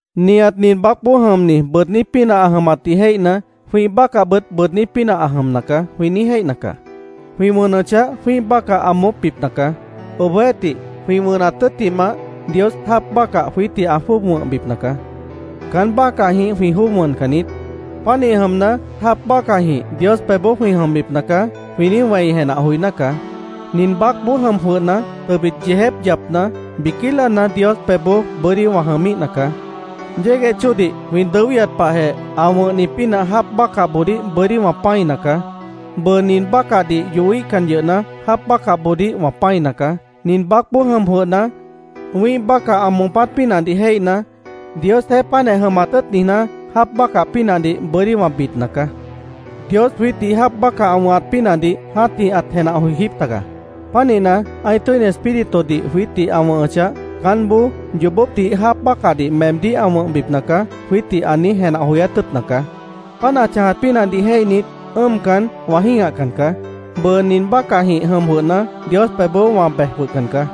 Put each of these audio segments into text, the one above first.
Nihat nin baácboó jʉmni bʉʉdní pínah ã jʉmatdih jéihna, “Jwĩ́ih bácahbʉt bʉʉdní pínah ã jʉmna caá”, jwĩ niíj jéihna caá. Jwĩ wʉnʉchah, jwĩ́ih bácah ã moópbipna caá. Obohjeéhtih, jwĩ wʉnat tʉ́ttimah, Dios jáap bácah jwiítdih ã jwʉ́ʉb wʉ̃hbipna caá. Caán bácahjĩh jwĩ jwʉ́ʉb wʉncan niít. “Pánih jʉmna, jáap bácahjĩh Dios pebhboó jwĩ jʉmbipna caá”, jwĩ niíj wẽi jenah joiná caá. Nin baácboó jʉm jwʉhna, tʉbit yeejép yapna, biquí láana Dios pebhboó bʉ́dí wã jʉmíhna caá. Yégueh chóodih jwĩ dʉwíhat pahjeh ã wʉ̃hni pínah jáap bácahboodíh bʉ́dí wã pã́ina caá. Bʉʉ nin bácahdih yohíhcan yʉhna, jáap bácahboodíh wã pã́ina caá. Nin baácboó jʉm jwʉhna, wĩ́ih bácah ã moopát pínahdih jéihna, Diosjeéh páantjeh jʉmat tʉ́ʉt niijná, jáap bácah pínahdih bʉ́dí wã bidna caá. Dios jwiítdih jáap bácah ã wʉ̃hat pínahdih jã́tih ãt jenah joijíp taga. Pánihna, ã́ih Tʉ́ini Espíritudih jwiítdih ã wʉ̃hʉchah, caánboó “Yoobópdih jáap bácahdih meemdíh ã wʉ̃hbipna caá”, jwiítdih ã niíj jenah joyát tʉ́ʉtna caá. Páant ã chãjat pínahdih jéihnit, ʉ́ʉmcan, wã jĩ́gahcan caá. Bʉʉ nin bácahjĩh jʉm jwʉhna, Dios pebhboó wã bej jwʉhcan caá.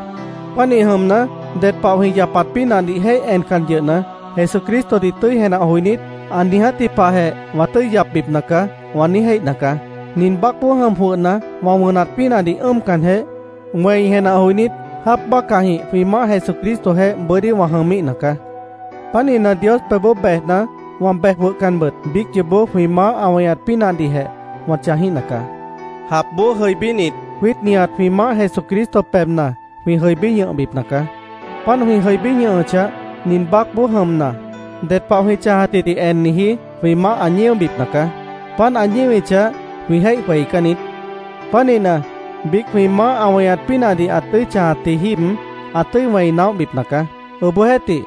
Pánih jʉmna, ded pah jwĩ yapat pínahdih jéih encan yʉhna, Jesucristodih tʉ́i jenah joinít, “Ã niijátji pahjeh wã tʉ́i yapbipna caá”, wã niíj jéihna caá. Nin baácboó jʉm jwʉhna, wã wʉnat pínahdih ʉ́ʉmcanjeh, wẽi jenah joinít, jáap bácahjĩh jwĩ Maáh Jesucristojeéh bʉ́dí wã jʉmíhna caá. Pánihna, Dios pebhboó bejna, wã bej jwʉhcanbʉt, biíc yoobó jwĩ Maáh ã weñat pínahdihjeh wã chãjíhna caá. Japboó jʉibínit, jwiít nihat jwĩ Maáh Jesucristo pebhna jwĩ jʉibí ñʉhbipna caá. Páant jwĩ jʉibí ñʉhʉchah, nin baácboó jʉmna, ded pah jwĩ chãjatjidih enniji jwĩ maáh ã ñíobipna caá. Páant ã ñíwichah, jwĩ jéih jweicán niít. Pánihna, biíc jwĩ Maáh ã weñat pínahdih ã tʉ́i chãjatji jíib, ã tʉ́i wẽi naóhbipna caá. Obohjeéhtih,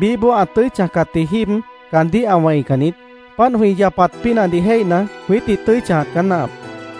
biíhboó ã tʉ́i chãjcatji jíib, caandíh ã wẽican niít. Páant jwĩ yapat pínahdih jéihna, jwiítdih tʉ́i chãjat caá náahap.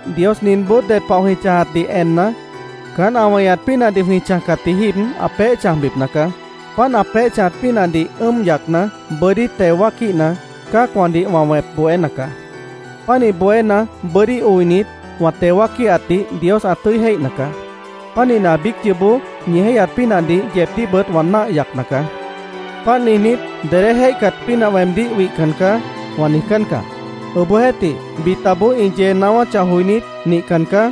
Dios ninboó ded pah jwĩ chãjatdih enna, caán ã weñat pínahdih jwĩ chãjcatji jíib ã peéh chãjbipna caá. Páant ã peéh chãjat pínahdih ʉ́ʉm yacna, bʉ́dí teo wáaquíhna, cã́acwãdih wã wẽp bohéna caá. Pánih bohéna, bʉ́dí oinit, wã teo wáaquíhatdih Dios ã tʉ́i jéihna caá. Pánihna, biíc yoobó ñi jéihyat pínahdih yeebdíhbʉt wã náah yacna caá. Páant niijnít, “Dedé jéihcat pínah weemdíh wihcan caá”, wã niijcán caá. Obohjeéhtih, bitaboó ĩ yee naáwáchah joinít, “Nihcan caá.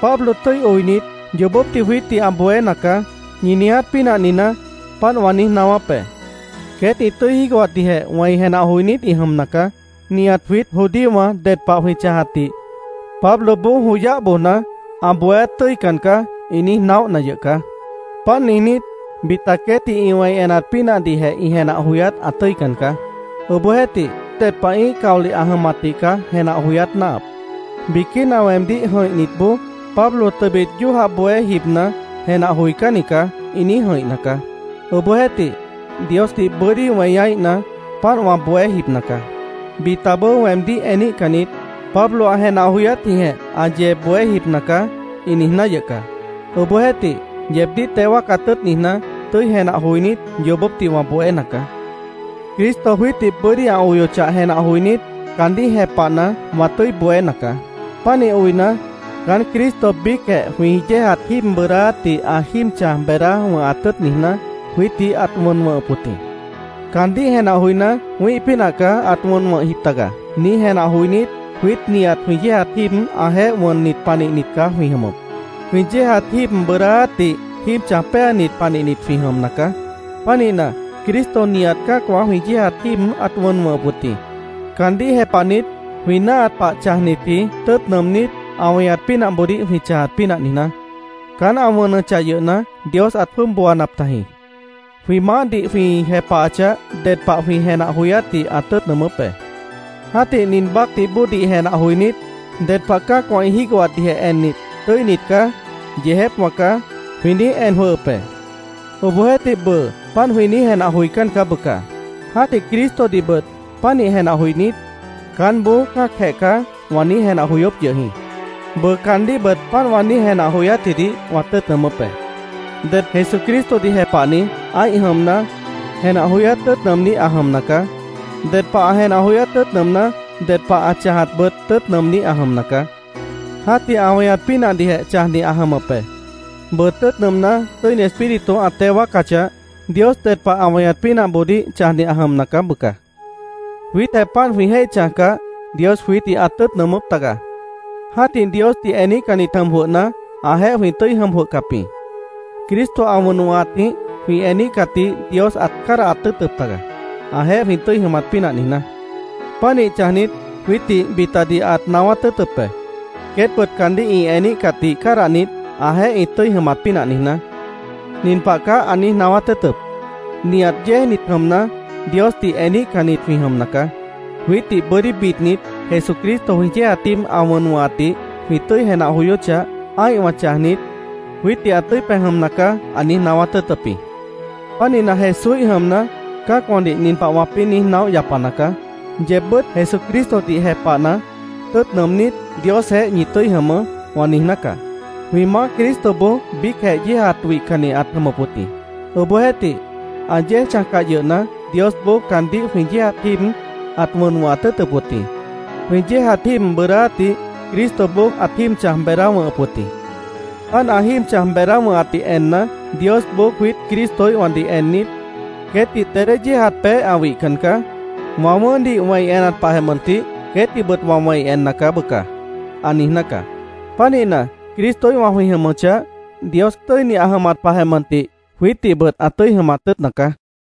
Pablo tʉ́i oinit, yoobópdih jwiítdih ã bohéna caá”, ñi niiját pínah niijná, páant wã niíj naáwáp be. Queét ĩ tʉ́i jígohatdihjeh wẽi jenah joinít ĩ jʉmna caá. “Nihat jwiít judíowã ded pah jwĩ chãjatdih Pabloboó joyáh bojna, ã bohéát tʉ́ican caá”, ĩ niíj naóhna yʉh caá. Páant niijnít, bita queétdih ĩ wẽi enat pínahdihjeh ĩ jenah joyát ã tʉ́ican caá. Obohjeéhtih, ded pah ĩ́ih caolih ã jʉmatdih caá jenah joyát náahap. Biquína weemdíh jʉ̃ihnitboó “Pablo tʉbit yójah bohé jibna, jenah joicánni caá”, ĩ niíj jʉ̃ihna caá. Obohjeéhtih, Diosdih bʉ́dí weñaíhna, páant wã bohé jibna caá. Bitaboó weemdíh eníhcannit, “Pablo ã jenah joyátjĩhjeh ã yee bohé jibna caá”, ĩ niijná yʉh caá. Obohjeéhtih, yeebdíh teo wáacat tʉ́ʉt niijná, tʉ́i jenah joinít, yoobópdih wã bohéna caá. Cristo jwiítdih bʉ́dí ã oyochah jenah joinít, caandíh jepahna, wã tʉ́i bohéna caá. Pánih oina, caán Cristo biícjeh jwĩ yéejat jíib bʉʉdáátdih ã jíib chãj beedá wʉ̃hat tʉ́ʉt niijná, jwiítdih ãt wʉn wʉ̃hʉp wʉt jĩ. Caandíh jenah joiná, “Wĩ́ih pínah caá ãt wʉn wʉ̃hjip taga”, niíj jenah joinít, jwiít nihat jwĩ yéejat jíib ãjeéh wʉnnit panihnit caá jwĩ jʉmʉp. Jwĩ yéejat jíib bʉʉdáátdih jíib chãj péanit panihnit jwĩ jʉmna caá. Pánihna, Cristo nihat cã́acwã jwĩ yéejat jíib ãt wʉn wʉ̃hʉp wʉt jĩ, caandíh jepahnit, jwĩ náahat pah chãjnitji tʉ́ʉt nʉʉmnít, ã weñat pínahboodíh jwĩ chãjat pínah niijná. Caán ã wʉnʉchah yʉhna, Dios ãt jwʉ́ʉb booanap tajĩ. Jwĩ Maáhdih jwĩ jepahachah, ded pah jwĩ jenah joyátdih ã tʉ́ʉt nʉʉmʉ́p be. Jã́tih nin baácdih bóodih jenah joinít, ded pah cã́acwã ĩ jígohatdihjeh ennit, “Tʉ́init caá. Yeejépwã caá”, jwĩ niíj en jwʉhʉp be. Obohjeéhtih, bʉʉ páant jwĩ niíj jenah joicán caá, bʉca. Jã́tih Cristodihbʉt pánih jenah joinít, “Caánboó cã́acjeh caá”, wã niíj jenah joyóp yʉh jĩ. Bʉʉ caandíhbʉt páant wã niíj jenah joyátjidih wã tʉ́ʉt nʉʉmʉ́p be. Ded Jesucristodih jepahni, ã́ih jʉmna, jenah joyát tʉ́ʉt nʉʉmní ã jʉmna caá. Ded pah ã jenah joyát tʉ́ʉt nʉʉmná, ded pah ã chãjatbʉt tʉ́ʉt nʉʉmní ã jʉmna caá. Jã́tih ã weñat pínahdihjeh chãjni ã jʉmʉp be. Bʉʉ, tʉ́ʉt nʉʉmná, Tʉ́ini Espíritu ã teo wáacachah, Dios ded pah ã weñat pínahboodíh chãjni ã jʉmna caá, bʉca. Jwiítjeh páant jwĩ jéih chãjcah, Dios jwiítdih ãt tʉ́ʉt nʉʉmʉ́p taga. Jã́tih, Diosdih eníhcannit jʉm jwʉhna, ãjeéh jwĩ tʉ́i jʉm jwʉhcap jĩ. Cristo ã wʉn wʉ̃hatjĩh jwĩ eníhcatdih Dios ãt cádahat tʉ́ʉtʉp taga, ãjeéh jwĩ tʉ́i jʉmat pínah niijná. Pánih chãjnit, jwiítdih bitadih ãt naáwát tʉ́ʉtʉp be, queétbʉt caandíh ĩ eníhcatdih cádahnit, ãjeéh ĩ tʉ́i jʉmat pínah niijná. Nin pah caá ã niíj naáwát tʉ́ʉtʉp: “Nihat yéejnit jʉmna, Diosdih eníhcannit jwĩ jʉmna caá. Jwiítdih bʉ́dí bidnit, Jesucristo jwĩ yéejat jíib ã wʉn wʉ̃hatdih jwĩ tʉ́i jenah joyóchah, ã́ihwã chãjnit, jwiítdih ã tʉ́i pej jʉmna caá”, ã niíj naáwát tʉ́ʉtʉp jĩ. Pánihna, Jesúíh jʉmna, cã́acwãdih nin pah wãpĩ́ niíj naóh yapana caá: “Yeebbʉ́t Jesucristodih jepahna, tʉ́ʉt nʉʉmnít, Diosjeéh ñi tʉ́i jʉmʉʉ́”, wã niijná caá. Jwĩ Maáh Cristoboó biícjeh yéejat wihcanni ãt jʉmʉp wʉt jĩ. Obohjeéhtih, ã yéej chãjcah yʉhna, Diosboó caandíh jwĩ yéejat jíib ãt wʉn wʉ̃hat tʉ́ʉtʉp wʉt jĩ. Jwĩ yéejat jíib bʉʉdáátdih Cristoboó ãt jíib chãj beedá wʉ̃hʉp wʉt jĩ. Páant ã jíib chãj beedá wʉ̃hatdih enna, Diosboó jwiít Cristoíhwãdih ennit, “Queétdih dedé yéejat peéh ã wihcan caá. Wã wʉ̃ʉ́hdih wẽi enat pahjeh mʉntih, queétdihbʉt wã wẽi enna caá, bʉca”, ã niijná caá. Pánihna, Cristoíhwã jwĩ jʉmʉchah, Dios tʉ́ini ã jʉmat pahjeh mʉntih jwiítdihbʉt ã tʉ́i jʉmat tʉ́ʉtna caá.